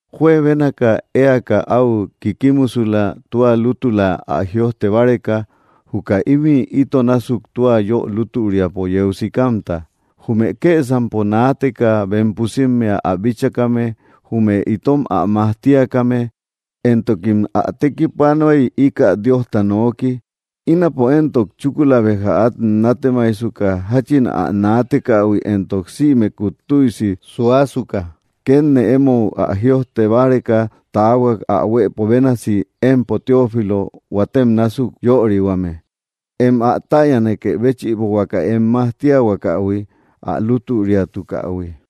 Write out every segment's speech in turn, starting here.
Juebénaka éaka áu kikkimusula tua lútula ä jïojte báreka juka ímï ito násuk tua yö lútüriapo yeu sikamta, jume kësampo naateka bem pusimmea ä bíchakame jume itom ä majtiakame, éntokim ä tekipanuay íkä Diosta nooki. Ínapo éntok chúkula béja át nátemaijsuka jáchin ä naatekähui éntok sïmekut tüisi suasuka, kétne émou ä jïojte báreka taahuak ä huëpo bénasi, empo Teófilo huatem násuk yörihuame, em ä täyanakë béchïbo huaka em majtiahuakähui ä lútüriatukähui.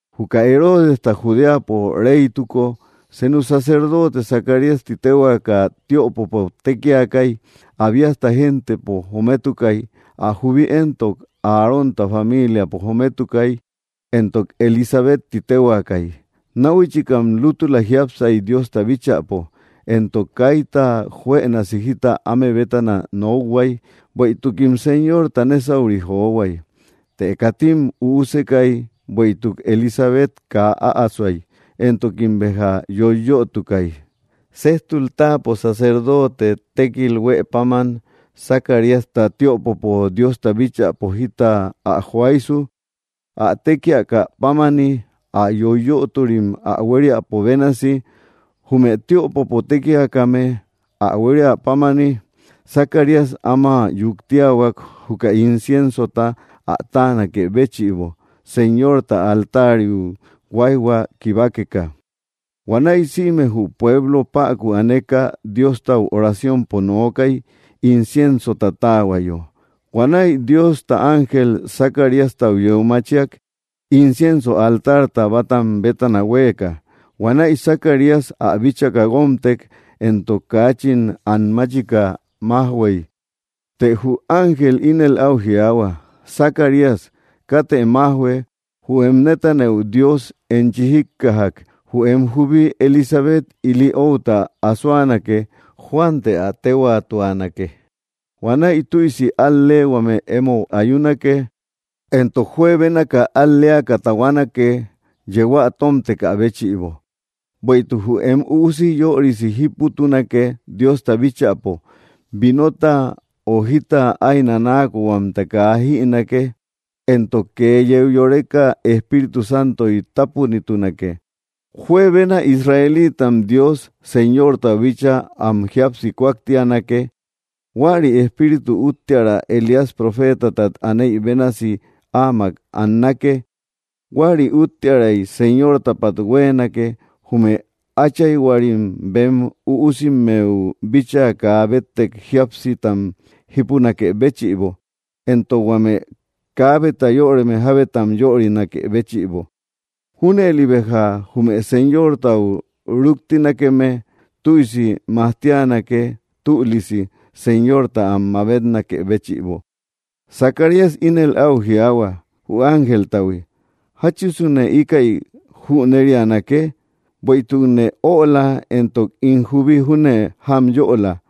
Juka Heroodesta Judeapo reytuko, senu sacerdote Zacarías ti téhuaaka tiöpopo tékiakay, Abíasta géntepo jometukay. Ä jubi éntok Arónta familiapo jometukay, éntok Elisabet ti téhuaakay. Náhuichikam lútula jiápsay Diosta bíchäpo, éntok kaita juënasi jita áme bétana nokhuay, bueïtukim Señorta nésauri johuay. Të katim üusekay, bueïtuk Elisabet kaa äasoay, éntokim, béja yoiyötukay. Sejtul táapo, sacerdoote tékil huë páman Zacaríasta tiöpopo Diosta bíchäpo jita ä joaysu, ä tékiakä pámani, ä yoiyöturim ä huériapo bénasi, jume tiöpopo tékiakame ä huéria pámani, Zacarías áma yuktiahuak, juka inciensota ä táanakë béchïbo, Señorta altariu huáijhua kibakeka. Huanäi sïme jü pueblo päku aneka Diostau oraciompo nokay, inciensota táahuayo. Huanäi Diosta ángel Zacariastau yeu machiak, incienso altarta bátam bétana hueka. Huanäi, Zacarías ä bíchaka guómtek, éntok kaachin an máchika majhuëy. Të jü ángel ínel áu jiaahua: —Zacarías, katë májhue, jü em nétanëu Dios enchi jíkkajak. Jü em jubi Elisabet ili outa asoanake. Juan të ä téhuaatuanake. Huanäi tüisi al‑leehuame émou ayunake, éntok juebénaka al‑leaka tahuanake yehuä tómtekä béchïbo, bueïtuk jü em üusi yörisi jíputunake Diosta bíchäpo. Vinota o jita ái nanaa kóhuamta kaa ä jïnake, éntok kee yeu yoreka Espíritu Santoy tápunitunake. Juebena Israelitam Dios Señortau bíchaa am jíapsi kúaktianake. Huäri Espíritu úttiära Elías profeetatat aneï bénasi áamak annake, huäri úttiäray Señortapat huéenake, jume áchayhuarim bem üusimmeu bíchaa kaa béttek jíapsitam jípunakë béchïbo, éntok huame kaabeta yöreme jábetam yörinakë béchïbo. Júnëli béja jume Señortau rúktinakeme tüisi majtianake tülisi Señorta am mabetnakë béchïbo. Zacarías ínel áu jiaahua jü ángeltahui: —¿Jáchisune íkäi jüneríanake? Bueïtukne öla, éntok ín jubi júne jámyöla.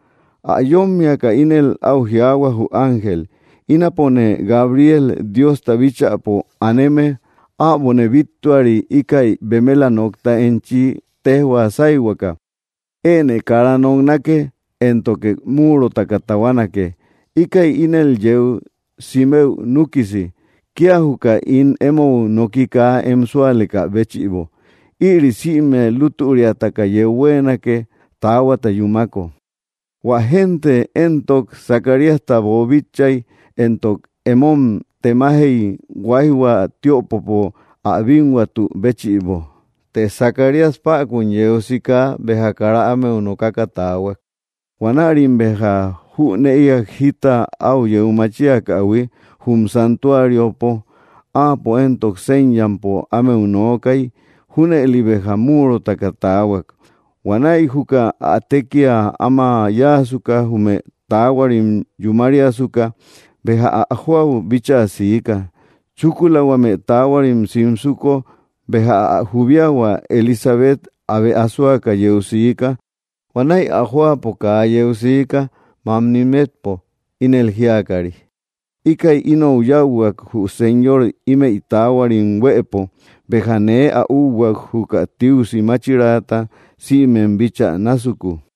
Ä yómmiaka ínel áu jiaahua jü ángel: —Ínapone Gabriel, Diosta bíchäpo aneme. Äbone bíttuari íkäi bemela nokta enchi téjhua sáyhuaka. Enë kara noknake, éntoke múurotaka tahuanake, íkäi ínel yeu simëu núkisi, kía juka ín émou noki kaa em súalekä béchïbo. Ïri sïme lútüriataka yeu huéenake, taahuata yúmako. Huä génte éntok Zacaríasta boobíchaïhuiy, éntok emom temajey huaijhua tiopopo ä bínhuatü béchïbo. Të Zacarías päkun yeu sika béja kara ámeu nokaka taahuak. Huanärim béja jünëiak jita áu yeu machiakähui jum santuariopo, áapo éntok séñampo ámeu nookay, junëli béja múurotaka taahuak. Huanäi juka ä tékia áma yáasuka, jume taahuarim yúmariasuka, béja ä jóau bíchaa siika. Chúkula huame taahuarim simsuko, béja ä jubiahua Elisabet abe asoaka yeu siika. Huanäi ä jóapo kaa yeu siika, mamni metpo, ínël jíakari: “Íkäi inou yáuhuak, jü Señor ímëi taahuarim huëpo, béja nee ä úhuak, juka tiusi máchiraata sïmem bíchä násuku.”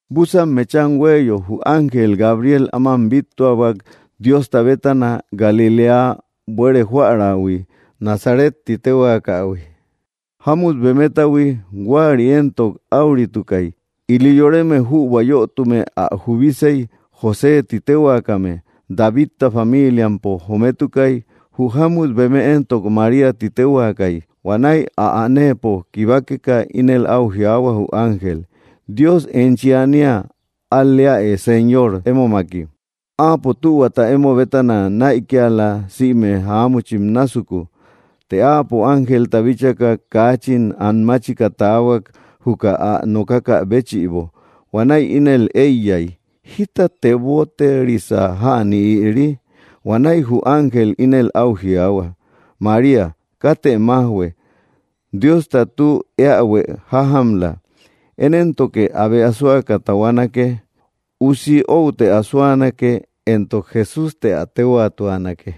Búsan mecham huéeyo, jü ángel Gabriel áman bíttuahuak Diosta bétana, Galiléa buere joärahui Nazaret ti téhuakähui, jámut bemetahui. Huäri éntok áuritukay, ili yoreme jübua yötume ä jubisey, José ti téhuaakame. Davidta familiampo jometukay. Jü jámut beeme éntok María ti téhuaakay. Huanäi ä anëpo kibakeka, ínel áu jiaahua jü ángel: —¡Dios enchi ania al‑leäe! Señor émomaki. Áapo tühuata emo bétana näikiala sïme jáamuchim násuku. Të áapo ángelta bíchaka, kaachin an máchika taahuak, juka ä nokakä béchïbo. Huanäi ínel éiyay: —¿Jíta teboterisa jäni ïri? Huanäi jü ángel ínel áu jiaahua: —María, katë májhue. Diosta tü eähue jájamla. Én éntok abe asoake tahuanake. Usi outë asoanake, éntok JESÚS të ä téhuaatuanake.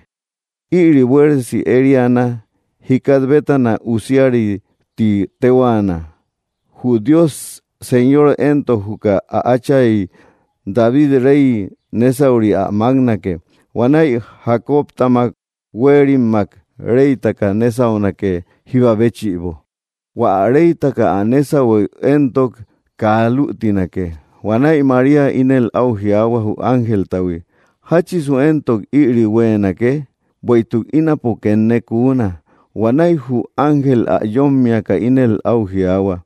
Ïri buéresi ériana. Jikat bétana usiari ti téhuaana, jü Dios Señor éntok juka ä átchay David Rey nésauri ä máknake. Huanäi Jacobtamak huéerimmak reytaka nésaunake jíba béchïbo. Huä ä reytaka ä nésahueu éntok kaa lütinake. Huanäi María ínel áu jiaahua jü ángeltahui: —¿Jáchisu éntok ïri huéenake, bueïtuk ínapo kennee kuuna? Huanäi jü ángel ä yómmiaka ínel áu jiaahua: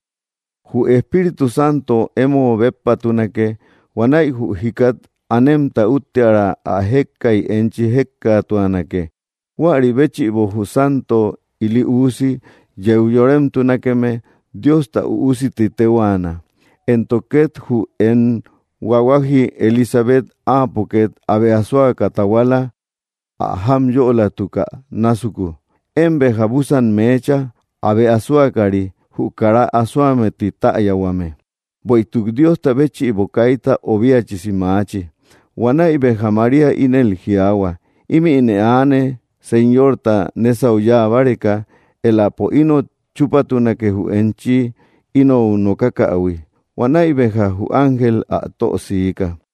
—Jü Espíritu Santo emo béppatunake. Huanäi jü jikat anemta úttiära ä jékkay enchi jékkatuanake. Huäri béchïbo jü santo ili usi yeu yoremtunakeme, Diosta Üusi ti téhuaana. Éntok két jü em huahuaji Elisabet, áapo két abe asoaka tahuala, ä jámyölatukä násuku, én béja búsan meecha, abe asoakari, jü kara asoame ti täyahuame, bueïtuk Diosta béchïbo kaita obiachisi maachi. Huanäi béja María ínel jiaahua: —Ímïne aane, Señorta nésau yáa báreka. Éläpo inot chúpatunake jü enchi inou nokakähui. Huanäi béja jü ángel ä tö siika.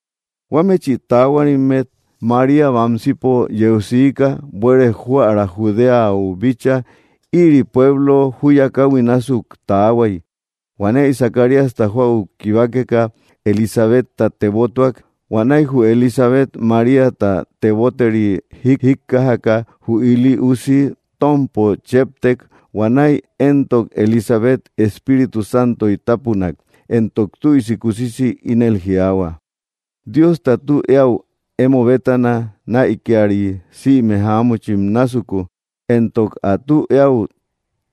Huámechi taahuarimmet María bamsipo yeu siika, buere joära Judeau bíchaa; ïri pueblo júya káhui násuk taahuay. Huanäi Zacaríasta jóau kibakeka, Elisabetta tebotuak. Huanäi jü Elisabet Maríata teboteri jíjikkajaka, jü ili usi tómpo chéptek. Huanäi éntok Elisabet Espíritu Santoy tápunak, éntok tüisi kusisi ínel jiaahua: —Diosta tü eäu emo bétana näikiari sïme jáamuchim násuku, éntok ä tü eäu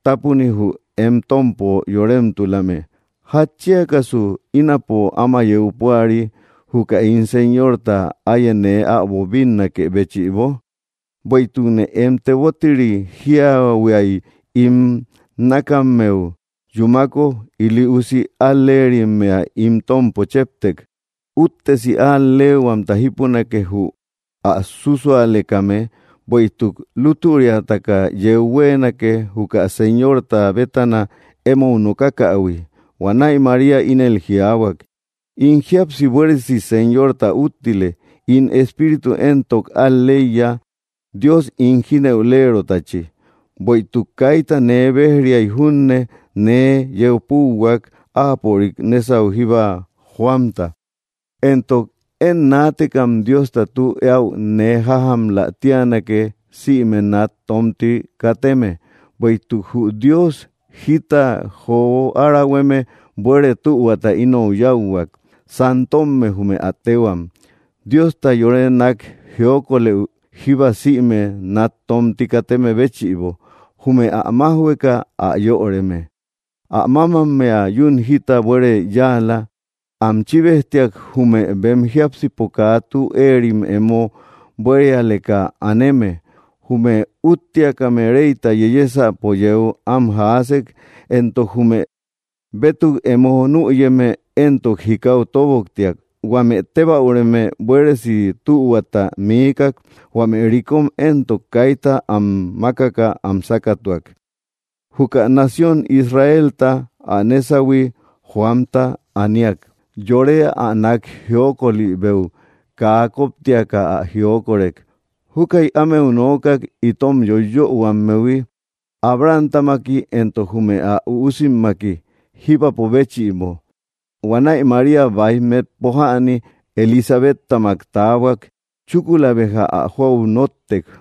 tápuni jü em tómpo yoremtulame. ¿Jatchiakasu ínapo áma yeu púari, juka ín Señorta áye nee äbo bínnakë béchïbo? Bueïtukne em teboteri jíahuia im nakammeu yúmako, ili usi al-lerimmea ín tómpo chéptek. Úttesi al‑leehuamta jípunake jü ä súsualekame, bueïtuk lútüriataka yeu huéenake juka Señorta bétana émou nokakähui. Huanäi María ínel jiaahuak: In jíapsi buéresi Señorta úttile. In espíritu éntok al‑leiya, Dios ín jínëulerotachi. Bueïtuk kaita nee béj-riay junne, nee yeu púuhuak, áapörik nésau jíba joamta, éntok, én naatekam Diosta tü eäu nee jájamlä tíanake sïme nat tomti kateme. Bueïtuk jü Dios jita jo árahueme buere tühuata inou yáuhuak. Santomme, jume ä téhuam. Diosta yore nak jiokolëu jíba sïme nat tomti kateme béchïbo. Jume ä majhuëka ä yöreme. Ä mámammea yún jita bueere yáala, am chíbejtiak jume bem jiápsipo kaa tü eerim emo buérialeka aneme. Jume úúttiakame reyta yeyesäpo yeu am jaasek; éntok jume bétuk emo nüyeme éntok jikau tóboktiak. Huame tébäureme buéresi tühuata miikak; huame rikom éntok kaita am makaka am sákatuak. Juka nación Israelta ä nésahui joamta aniak, yore ä nak jiokolibeu kaa koptiaka ä jiokorek. Júkäi ámeu nookak, itom yoiyöhuammehui, Abrahamtamaki, éntok jume ä üusimmaki, jíbapo béchïbo. Huanäi María báij metpo jäni Elisabetamak taahuak. Chúkula béja ä jóau nóttek.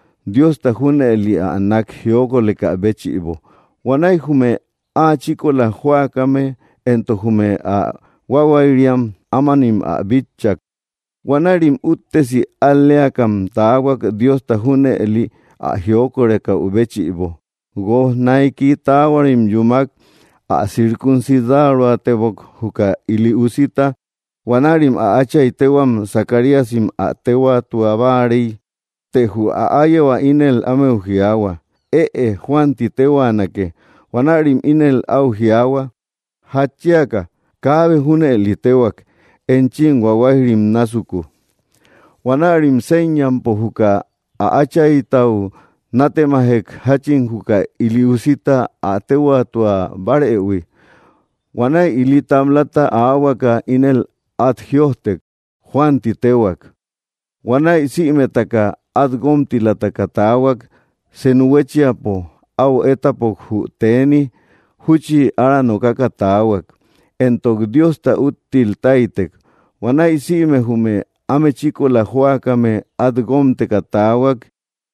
Diosta jüneli ä nak jiokoleka béchïbo. Huanäi jume áa chíkola jóakame éntok jume ä huahuayriam ámanim ä bitchak. Huanärim úttesi al‑leakam taahuak, Diosta junëli ä jiokorekäu béchïbo. Guoj naiki taahuarim yúmak, ä circuncidaroatebok, juka ili usita. Huanärim ä átchay téhuam, Zacaríasim, ä téhuaatua báarey. Të jü ä áyehua ínel ámeu jiaahua: —Ëe; Juan ti téhuaanake. Huanärim ínel áu jiaahuak: —¿Jatchiaka? Kaabe junëli téhuak enchim huahuayrim násuku. Huanärim séñampo juka ä áchaytau nátemajek, jáchin juka ili usita ä téhuaatua bárëhui. Huanäi ili tablata aahuaka, ínel át jïojtek: “Juan ti téhuak.” Huanäi sïmetaka át guómtilataka taahuak. Senu huéchiapo áu étapok jü teeni. Júchi ára nokaka taahuak, éntok Diosta úttil táytek. Huanäi sïme jume áme chíkola jóakame át guómteka taahuak.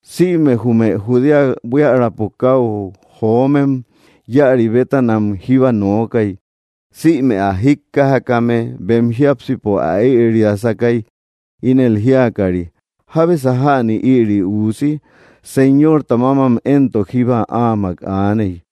Sïme jume Judea buiärapo káu jómem, íäri bétanam jíba nookay. Sïme ä jíkkajakame bem jiápsipo ä ëriasakay, ínel jíakari: —¿Jábesa jäni ïri uusi? Señorta mámam éntok jíba áamak aaney.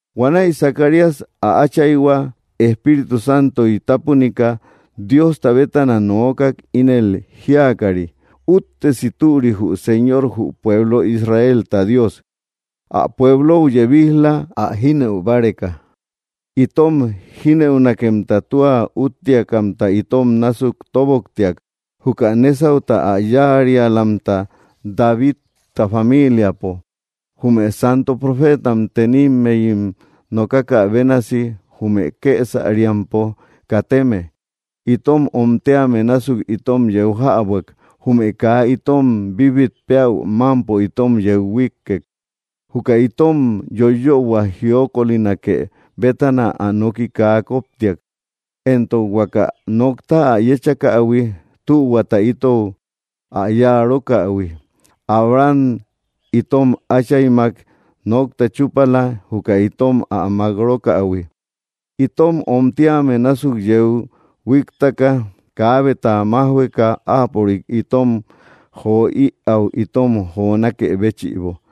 Huanäi Zacarías, ä áchayhua, Espíritu Santoy tápunika, Diosta bétana nookak, ínel jíakari: Úttesi türi jü Senor, jü pueblo Israelta Dios. Ä pueblou yebij‑la, ä jínëu báreka. Itom jínëunakemta tua úttiakamta itom násuk toboktiak, jukä nésauta ä yáarialamta Davidta familiapo. Jume santo profeetam tenimmeyi nokakä bénasi, jume kësamriapo kateme: itom omtíame násuk itom yeu jäbuak; jume kaa itom bíbit péäu mámpo itom yeu huíkkek. Juka itom yoiyöhuam jiokolinake bétana ä noki kaa koptiak, éntok huaka nokta ä yechakähui, tühuata itou ä yáa rókähui. Abraham itom áchaymak nokta chúpala, juka itom ä mák rókähui, itom omtíame násuk yeu huíktaka, kaabeta májhueka, áapörik itom jo ïau itom jonákë béchïbo,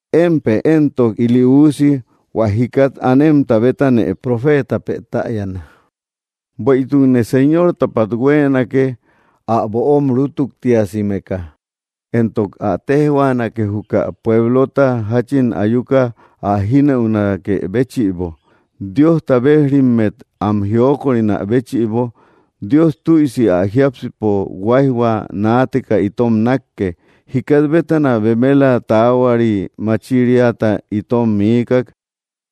Émpë éntok, ili uusi, hua jikat anemta bétanë profeetapë täyana, bueïtukë Señortapat huéenake ä böom rútuktiasimeka. Éntoke ä téjhuaanake juka pueblota, jáchin ayuka ä jinëutunakë bëchïbo, Diosta bejrimmet am jiokorina béchïbo. Dios tüisi ä jiápsipo huáijhua naateka itom nákke, jikat bétana bemela taahuari machiriata itom miikak,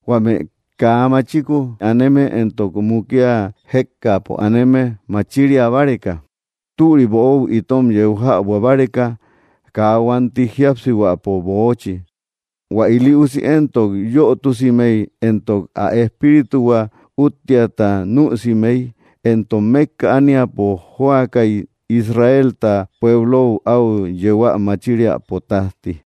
huame kaa machiku aneme éntok mukia jékkaapo aneme, machiria báreka, türi böou itom yeu jäbua báreka, kaa huanti jíapsihuäpo böochi. Huä ili usi éntok yötusimey, éntok ä espírituhua úttiata nüsimey, éntok mékka ániapo jóakay Israelta pueblou áu yehuä machiriäpo tájti.